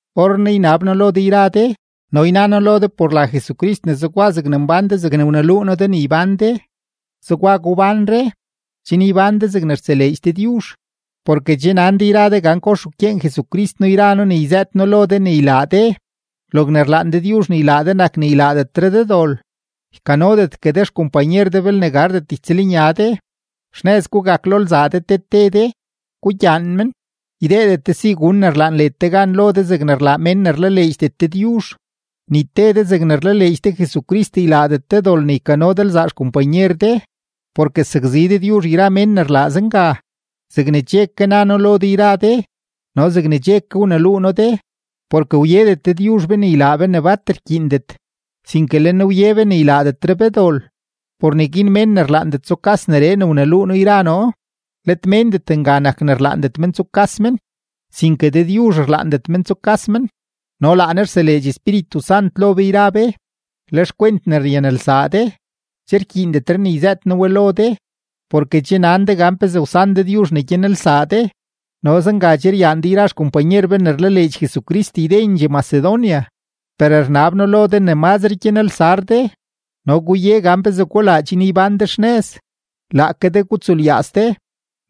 Orrenaa ynab noo lo de yra de no yna noo lo de por la Jesucrist ne zegwa zegne che mbán de zegne wneluu noo de ne ybán de, zegwa gubánre, chen ybán de zegne rtseleedx Dëdyuzh. Porke che nan de yra de gan kox wkyeen Jesucrist noo yra noo ne yzëët noo lo de ne ylaa de. Logne rlaan Dëdyuzh ne ylaa de nak ne ylaadetre de dol. Ykanodetgue de xkompanyer de belne gardet ytsëlnya de. Xnëz gugak lo lzaa de te te de, gugyaan men. Ydeedet de si gun ne rlaan led de gan lo de zegne rlaa mén ne rlaleedxdet Dëdyuzh. Ni te de zegne rlaleedx de Jesucrist ylaadet de dol ne ykano de lzaa xkompanyer de, porke sakzi Dëdyuzh yra mén ne rlaa zenga, zegne che ke na noo lo de yra de no zegne che ke wneluu noo de. Porke wyedet Dëdyuzh be ne ylaa be ne bat rkyiindet, sinke le Ne wye be ne ylaadetre be dol. Por neguin mén ne rlaandet tsukas neree ne wneluu noo yra noo, let méndet nga nak ne rlaandet men tsukas men, sinke Dëdyuzh rlaandet men tsukas men, no laa Ne rseleedx Espíritu Sant lo be yra be. Le xkwent ne ryanelsaa de, che rkyiindetre ne yzëët noo we lo de, porke che nan de gan pezee wsan Dëdyuzh ne gyanelsaa de. No zenga che ryaan de yra xkompanyer be ne rlaleedx Jesucrist ydendxee Macedonia. Per rnab noo lo de ne mazre gyanelsar de. No guye gan pezee gulaa chen ybán de xnëz, laake de gutsulyaaz de,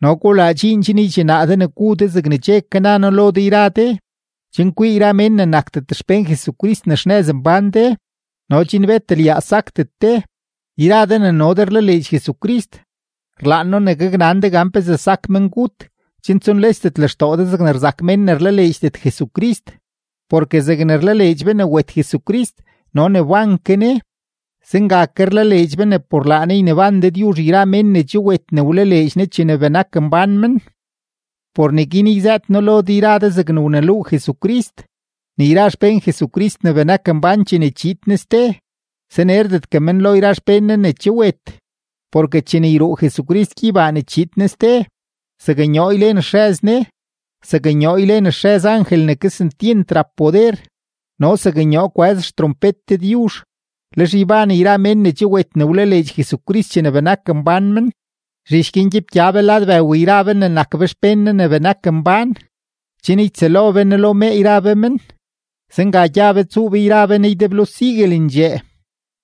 no gulaa dxiin chen ydxinaa de ne gu de zegne che ke na noo lo de yra de, chen kwii yra mén ne nakdet xpén Jesucrist ne xnëz mbán de no chen bet lyaaz sakdet de. Yra de ne no de rlaleedx Jesucrist, rlaan noo ne gaknan de gan pezee sak mengut, chen tsunlesdet lextoo de zegne rzak mén ne rlaleedxdet Jesucrist. Porke zegne rlaleedx be ne wet Jesucrist no ne wban ke Ne, zenga ke rlaleedx be ne por laa Ne yneban Dëdyuzh yra mén ne che wet ne wlaleedx Ne chene benak mbán men. Por neguin yzëët noo lo de yra de zegne wneluu Jesucrist, ne yra xpén Jesucrist ne benak mbán chene chiid Ne ste, sanerdetgue men lo yra xpén Ne ne che wet. Porke chene yruu Jesucrist gyeybaa ne chiid Ne ste, zaknyoo ylen xrëz Ne, zaknyoo ylen xrëz angel ne kesentyent rap poder, no zaknyoo kwëz xtrompet Dëdyuzh, lex yban yra mén ne che wet ne wlaleedx Jesucrist chene benak mbán men. Zhich guin gyepgya be lad bëw yra be ne nak be xpén Ne ne benak mbán, chen ytsëlo be Ne lo mee yra be men, zenga gya be tsuu be yra be Ne ydeblo siguelendxee.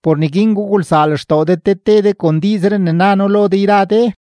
Por neguin gugulsaa lextoo de te te de kon diizree ne na noo lo de yra de.